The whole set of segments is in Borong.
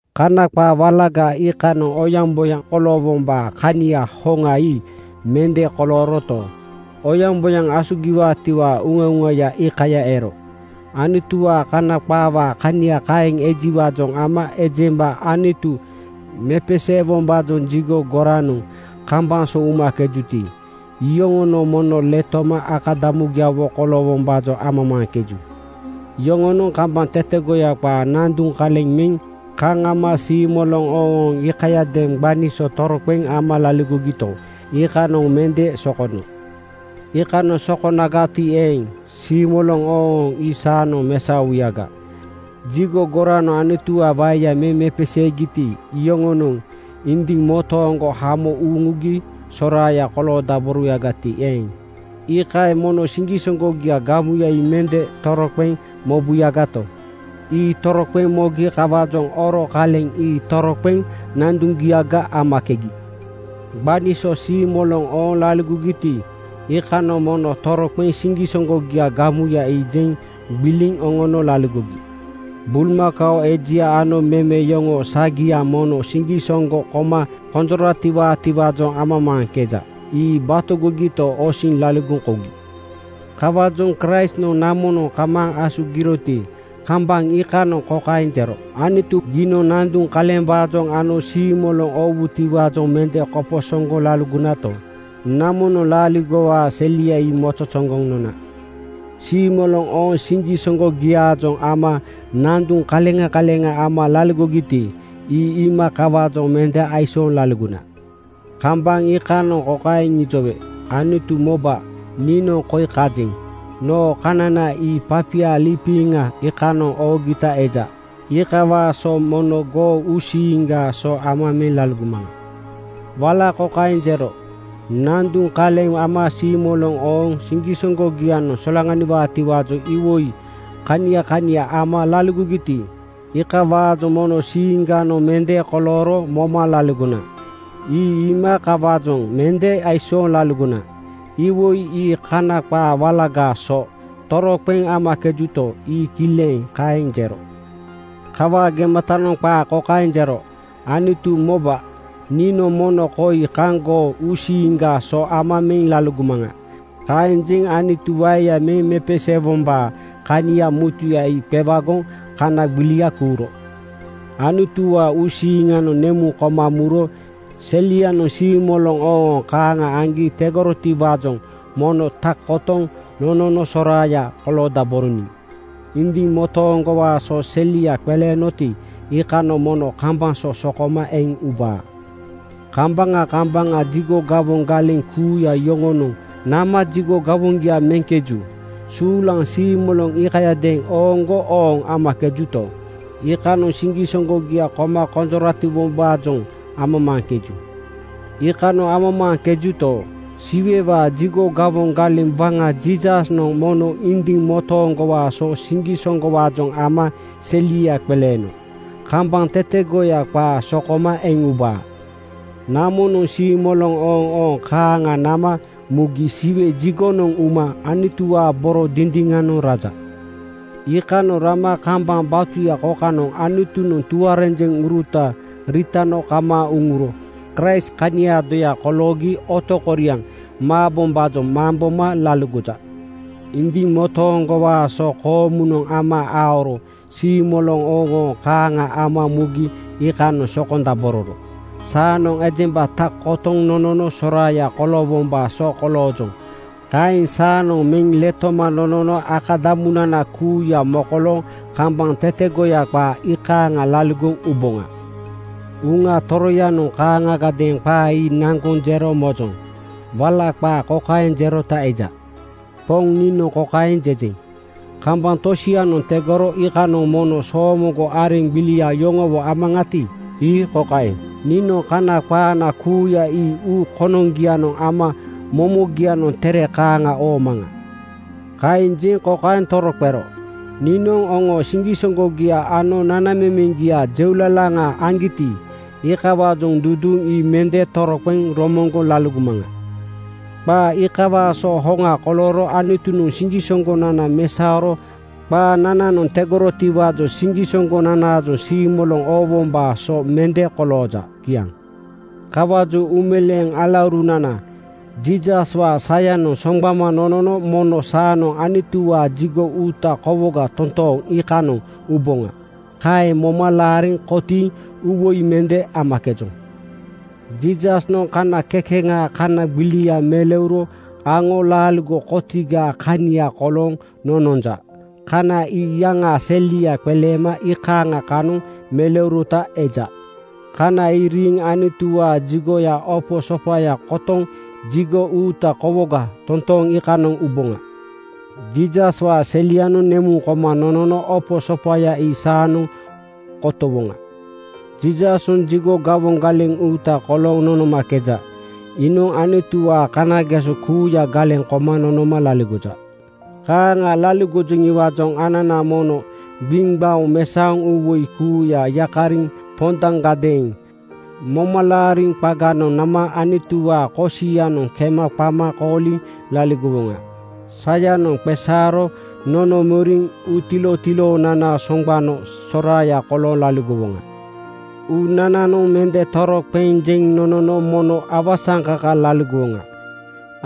Kana qaa walaga iikanoŋ oyaŋboyaŋ koloowombaa kania hoŋa ii mende kolooroto, oyaŋboyaŋ asugiwaatiwaa uŋauŋaya iikaya ero. Anutuwaa Kana qaawaa kania kaeŋ ejiwaajoŋ ama ejemba Anutu mepeseewombaajoŋ jigo goranoŋ kambaŋ so umakejuti, iyoŋonoŋ mono letoma akadamugiawo koloowombaajoŋ amamaaŋkeju. Yoŋonoŋ kambaŋ tetegoya qaa nanduŋ kaleŋ meŋ kaŋ ama siimoloŋ ooŋooŋ iikayadeeŋ gbani so toroqeŋ ama laligogito, iikanoŋ mende sokono. Iikanoŋ sokonagati eeŋ, siimoloŋ ooŋooŋ ii saanoŋ mesaowuyaga. Jigo goranoŋ Anutu waeya meŋ mepeseegiti, iyoŋonoŋ indiŋ motooŋgo hamo uŋugi soraaya koloodaborowuyagati eeŋ, iikaeŋ mono siŋgisoŋgogiaa gamuya ii mende toroqeŋ mobuyagato, ii toroqeŋ mogi. Kawaajoŋ oro kaleŋ ii toroqeŋ nanduŋgiaga amakegi. Gbani so siimoloŋ ooŋ laligogiti, iikanoŋ mono toroqeŋ siŋgisoŋgogiaa gamuya ii jeŋ gbiliŋ oŋono laligogi. Bulmakao ejia ano meme yoŋoo sagianoŋ mono siŋgisoŋgo koma konjoratiwaatiwaajoŋ amamaaŋkeja. Ii batogogito, osiŋ laligoŋ kougi. Kawaajoŋ Kraistnoŋ namonoŋ kamaaŋ asugiroti, kambaŋ iikanoŋ kokaeŋ jero, “Anutu, giinoŋ nanduŋ kalembaajoŋ ano siimoloŋ oowutiwaajoŋ mende koposoŋgoŋ laligonato, namonoŋ laaligowaa selia ii mozozoŋgoŋ nona. Siimoloŋ ooŋ siŋgisoŋgogiaajoŋ ama nanduŋ kaleŋa kaleŋa ama laligogiti, ii iima kawaajoŋ mende aisooŋ laligona. Kambaŋ iikanoŋ kokaeŋ ijowe, ‘Anutu, moba, niinoŋ koi kajeŋ. Noo kanana ii papia liipiŋa iikanoŋ oogita eja. Iikawaa so mono goo uusiiŋgaa so ama meŋ laligomaŋa.’” Wala kokaeŋ jero, “Nanduŋ kaleŋ ama siimoloŋ ooŋ siŋgisoŋgogianoŋ solaŋaniwaatiwaajoŋ iwoi kania kania ama laligogiti, iikawaajoŋ mono siiŋganoŋ mende kolooro moma laligona. Ii iima kawaajoŋ mende aisooŋ laligona.” Iwoi ii Kana qaa walagaa so toroqeŋ amakejuto, ii kileŋ kaeŋ jero. Kawaa gematanoŋ qaa kokaeŋ jero, “Anutu moba, niinoŋ mono koi kaŋ goo uusiiŋgaa so ama meŋ laligomaŋa.” Kaeŋ jeŋ Anutu waeya meŋ mepeseewombaa kania mutuya ii qewagoŋ kana gbilia kuuro. Anutuwaa uusiiŋanoŋ nemuŋ koma muro selianoŋ siimoloŋ ooŋooŋ kaaŋa aŋgi tegorotiwaajoŋ mono tak kotoŋ nonono soraaya koloodaboroniŋ. Indiŋ motooŋgowaa so selia qeleenoti, iikanoŋ mono kambaŋ so sokoma eŋ ubaa. Kambaŋa kambaŋa jigo gawoŋ galeŋ kuuya yoŋonoŋ nama jigo gawoŋgia meŋkeju. Suulaŋ siimoloŋ iikayadeeŋ ooŋgo ooŋ amakejuto, iikanoŋ siŋgisoŋgogia koma konjoratiwombaajoŋ amamaaŋkeju. Iikanoŋ amamaaŋkejuto, Siwewaa jigo gawoŋ galeŋ waŋa Jiisasnoŋ mono indiŋ motooŋgowaa so siŋgisoŋgowaajoŋ ama selia qeleeno kambaŋ tetegoya qaa sokoma eŋ ubaa. Namonoŋ siimoloŋ ooŋooŋ kaaŋa nama mugi Siwe jigonoŋ uma Anutuwaa boro dindiŋanoŋ raja. Iikanoŋ rama kambaŋ batuya kokanoŋ Anutunoŋ tuarenjeŋuruta riitano kamaaŋ uŋuro Kraist kaniaa doya koloogi otokoriaŋ maabombaajoŋ mamboma laligoja. Indiŋ motooŋgowaa so koomunoŋ ama aoro siimoloŋ ooŋooŋ kaaŋa ama mugi iikanoŋ sokondabororo saanoŋ ejemba tak kotoŋ nonono soraaya koloowombaa so koloojoŋ. Kaeŋ saanoŋ meŋ letoma nonono akadamunana kuuya mokolooŋ kambaŋ tetegoya qaa iikaaŋa laligoŋ uboŋa. Uŋa Toroyanoŋ kaaŋagadeeŋ qaa ii naŋgoŋ jero mojoŋ. Wala qaa kokaeŋ jerota eja: “Poŋ niinoŋ kokaeŋ jejeŋ: Kambaŋ tosianoŋ tegoro iikanoŋ mono soomoŋgo areŋ gbilia yoŋowo amaŋati, ii kokaeŋ: Niinoŋ Kana qaana kuuya ii uu konoŋgianoŋ ama momogianoŋ tere kaaŋa oomaŋa.” Kaeŋ jeŋ kokaeŋ toroqero, “Niinoŋ yoŋoo siŋgisoŋgogia ano nanamemeŋgia jeulalaŋa aŋgiti, iikawaajoŋ duduuŋ ii mende toroqeŋ romoŋgoŋ laligomaŋa.” Qaa iikawaa so hoŋa kolooro Anutunoŋ siŋgisoŋgonana mesaoro qaanananoŋ tegorotiwaajoŋ siŋgisoŋgonanaajoŋ siimoloŋ oowombaa so mende kolooja. Kiaŋ. Kawaajoŋ uumeleeŋ alaurunana, Jiisaswaa sayanoŋ soŋgbama nonono mono saanoŋ Anutuwaa jigo uuta kowoga totooŋ iikanoŋ uboŋa. Kaeŋ moma laariŋ kotiiŋ uuwoi mende amakejoŋ. Jiisasnoŋ kana kekeŋaa kana gbilia meleuro aŋo laaligo kotigaa kania kolooŋ nononja. Kana ii iyaŋaa selia qeleema iikaaŋa kanoŋ meleurota eja. Kana ii riiŋ Anutuwaa jigoyaa opo sopaya kotoŋ jigo uuta kowoga totooŋ iikanoŋ uboŋa. Jiisaswaa selianoŋ nemuŋ koma nonono opo sopaya ii saanoŋ kotowoŋa. Jiisasnoŋ jigo gawoŋ galeŋ uuta kolooŋ nonomakeja. Iinoŋ Anutuwaanoŋ kanageso kuuya galeŋ koma nonoma laligoja. Kaaŋa laligojiwaajoŋ anana mono gbiŋgbaoŋ mesaoŋ uuwoi kuuya yakariŋ pondaŋgadeeŋ momalaari qaganoŋ nama Anutuwaa kosianoŋ kema qama kooliŋ laligowoŋa. Sayanoŋ qeesaaro nonomoriŋ uutilotiloonana soŋgbano soraaya kolooŋ laligowoŋa. Uunananoŋ mende toroqeŋ jeŋ nonono mono awasaŋkaka laligowoŋa.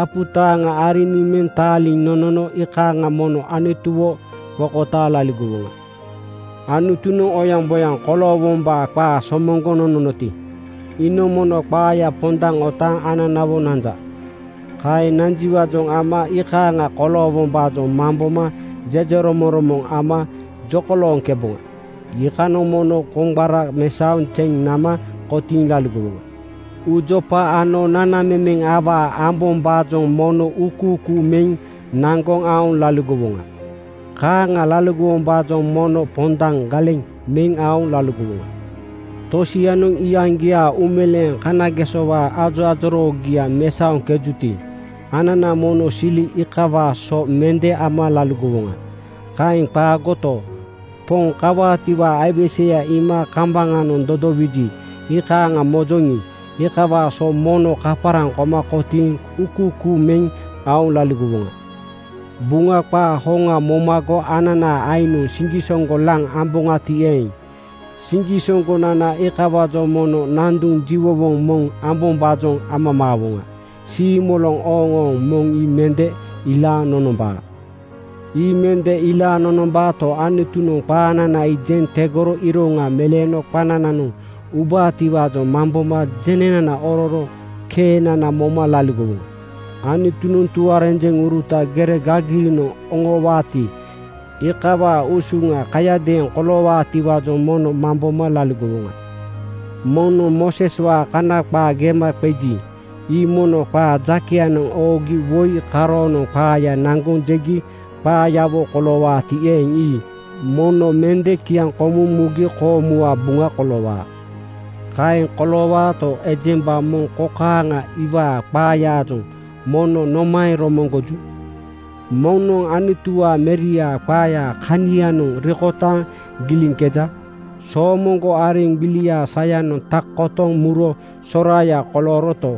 Apu taaŋa ariniŋ meŋ taaliŋ nonono iikaaŋa mono Anutuwo qokotaaŋ laligowoŋa. Anutunoŋ oyaŋboyaŋ koloowombaa qaa somoŋgoŋ nononoti, iinoŋ mono qaaya pondaŋ otaaŋ ananawo nanja. Kaeŋ nanjiwaajoŋ ama iikaaŋa koloowombaajoŋ mamboma jejeromoŋromoŋ ama jokolooŋkeboŋa. Iikanoŋ mono koŋgbara mesaoŋ zeŋ nama kotiiŋ laligowoŋa. Uujopa ano nanamemeŋ awaa ambombaajoŋ mono uukuukuu meŋ naŋgoŋ aoŋ laligowoŋa. Kaaŋa laligowombaajoŋ mono pondaŋ galeŋ meŋ aoŋ laligowoŋa. Tosianoŋ iyaŋgiaa uumeleeŋ kanagesowaa ajoajoroogia mesaoŋkejuti, anana mono sili iikawaa so mende ama laligowoŋa. Kaeŋ qaagoto, Poŋ kawaatiwaa aiweseya iima kambaŋanoŋ dodowiji iikaaŋ mojoŋi, iikawaa so mono kaparaŋ koma kotiiŋ uukuukuu meŋ aoŋ laligowoŋa. Buŋa qaa hoŋa momago ananaa aiŋnoŋ siŋgisoŋgo laŋ amboŋati eeŋ, siŋgisoŋgonana iikawaajoŋ mono nanduŋ jiwowoŋ moŋ ambombaajoŋ amamaawoŋa. Siimoloŋ ooŋooŋ moŋ ii mende ilaaŋ nonombaa. Ii mende ilaaŋ nonombaato, Anutunoŋ qaanana ii jeŋ tegoŋ iroŋa meleeno qanananoŋ ubaatiwaajoŋ mamboma jenenana ororo keenana moma laligowoŋa. Anutunoŋ tuarenjeŋuruta gere gagirinoŋ oŋoowaati, iikawaa usuŋa kayadeeŋ koloowaatiwaajoŋ mono mamboma laligowoŋa. Moŋnoŋ Mooseswaa Kana qaa gema qeji, ii mono qaa jakeyanoŋ ooŋgi woi karoonoŋ qaaya naŋgoŋ jegi qaayawo koloowaati eeŋ, ii mono mende kiaŋkomuŋ mugi koomuwaa buŋa koloowaa. Kaeŋ koloowaato, ejemba moŋ kokaaŋa iwaa qaayaajoŋ mono nomaeŋ romoŋgoju? Moŋnoŋ Anutuwaa Meriaa qaaya kanianoŋ rikotaaŋ giliŋkeja. Soomoŋgo areŋ gbiliaa sayanoŋ tak kotoŋ muro soraaya kolooroto,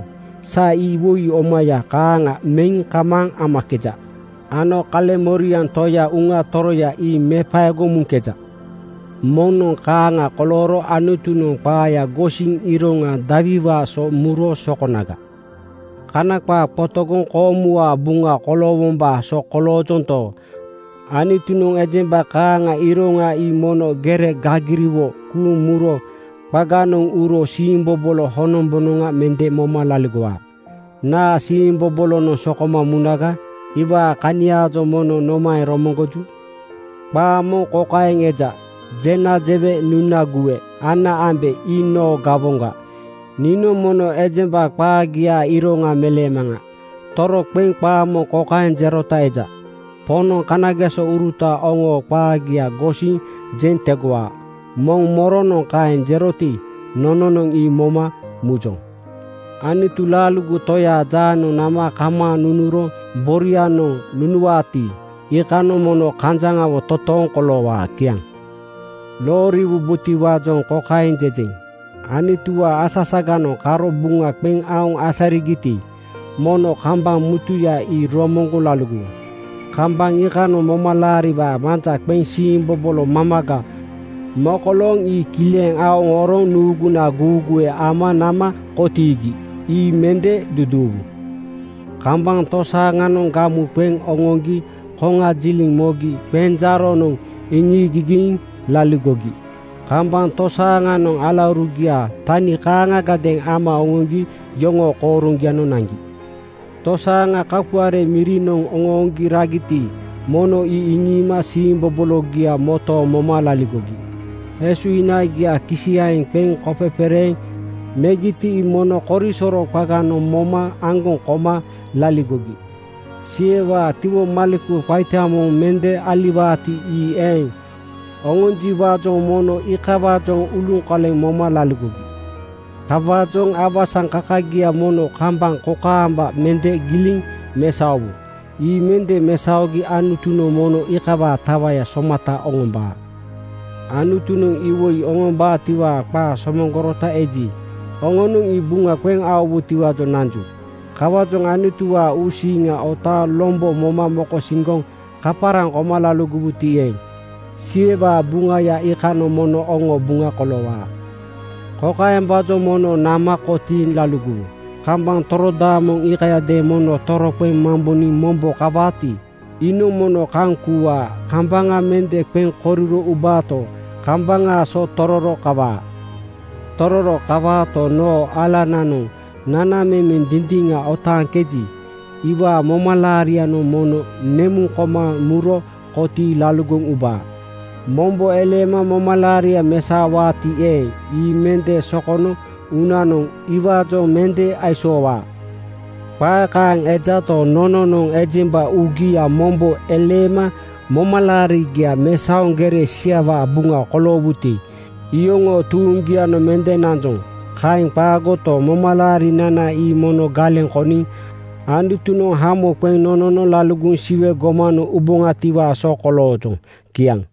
sa ii iwoi omaya kaaŋa meŋ kamaaŋ amakeja ano kaleŋmoriaŋ Toya Uŋa Toroya ii mepaegoŋ muŋkeja. Moŋnoŋ kaaŋa kolooro Anutunoŋ qaaya gosiŋ iroŋa dawiwaa so muro sokonaga? Kana qaa qotogoŋ koomuwaa buŋa koloowombaa so koloojonto, Anutunoŋ ejemba kaaŋaa iroŋa ii mono gere gagiriawo kuuŋ muro qaganoŋ uro siimbobolo honombonoŋa mende moma laligowaa. Naa siimbobolonoŋ sokoma munaga? Iwaa kaniaajoŋ mono nomaeŋ romoŋgoju? Qaa moŋ kokaeŋ eja, “Jena jewe, nuna guwe, ana ambe ii noo gawoŋga. Niinoŋ mono ejemba qaagiaa iroŋa meleemaŋa.” Toroqeŋ qaa moŋ kokaeŋ jerota eja, “Poŋnoŋ kanagesouruta oŋoo qaagia gosiŋ jeŋ tegowaa.” Moŋ moronoŋ kaeŋ jeroti, nononoŋ ii moma mujoŋ. Anutu laaligo Toyaa jaanoŋ nama kamaaŋ nunuro boria-noŋ nunuwaati, iikanoŋ mono kanjaŋawo totooŋ koloowaa. Kiaŋ. Looriwubotiwaajoŋ kokaeŋ jejeŋ: Anutuwaa asasaganoŋ karo buŋa qeŋ aoŋ asarigiti, mono kambaŋ mutuya ii romoŋgoŋ laligowu. Kambaŋ iikanoŋ momalaariwaa manja qeŋ siimbobolo mamaga mokolooŋ ii kileŋ aoŋ oroŋ nuuguna guuguwe ama nama kotiigi. Ii mende duduuwu. Kambaŋ tosaaŋanoŋ gamu qeŋ oŋoŋgi koŋajiliŋ mogi qenjaaronoŋ iŋiigigiiŋ laligogi. Kambaŋ tosaaŋanoŋ alaurugia tani kaaŋagadeeŋ ama oŋoŋgi yoŋoo kooroŋgianoŋ naŋgi. Tosaaŋa kapuare mirinoŋ oŋooŋgi ragiti, mono ii iŋiima siimbobologia motooŋ moma laligogi. Esuhinagia kisiyaeŋ qeŋ kopepereeŋ megiti, ii mono korisoro qaganoŋ moma aŋgoŋ koma laligogi. Siwewaa tiwomaleku qaita moŋ mende aliwaati, ii eŋ oŋonjiwaajoŋ moma iikawaajoŋ uluŋkoleŋ moma laligogi. Kawaajoŋ awasaŋkakagia mono kambaŋ kokaamba mende giliŋ mesaowu. Ii mende mesaogi Anutunoŋ mono iikawaa tawaya somata oŋombaa. Anutunoŋ iwoi oŋombaatiwaa qaa somoŋgorota eji, oŋonoŋ ii buŋa qeŋ aowutiwaajoŋ nanju. Kawaajoŋ Anutuwaa uusiiŋa otaaŋ lombo moma mokosiŋgoŋ kaparaŋ koma laligowuti eeŋ, Siwewaa buŋaya iikanoŋ mono oŋoo buŋa koloowaa. Kokaembaajoŋ mono nama kotiiŋ laligowu: Kambaŋ torodaamoŋ iikayadeeŋ mono toroqeŋ mamboniŋ “Mombo kawaati, iinoŋ mono kaŋ kuuwaa. Kambaŋa mende qeŋ koriro ubaato, kambaŋaa so tororo kawaa. Tororo kawaato, noo alananoŋ nanamemeŋ dindiŋa otaaŋkeji, iwaa momalaarianoŋ mono nemuŋ koma muro kotiiŋ laligoŋ ubaa. Mombo eleema momalaaria mesaowaati eeŋ, ii mende sokono uunanoŋ iwaajoŋ mende aisoowaa.” Qaa kaeŋ ejato, nononoŋ ejemba uugia mombo eleema momalaarigia mesaoŋ gere siawaa buŋa koloowuti, iyoŋoo tuuŋgianoŋ mende nanjoŋ. Kaeŋ qaagoto, momalaarinana ii mono galeŋ koniŋ Anutunoŋ hamo qeŋ nonono laligoŋ Siwe gomanoŋ uboŋatiwaa so koloojoŋ. Kiaŋ.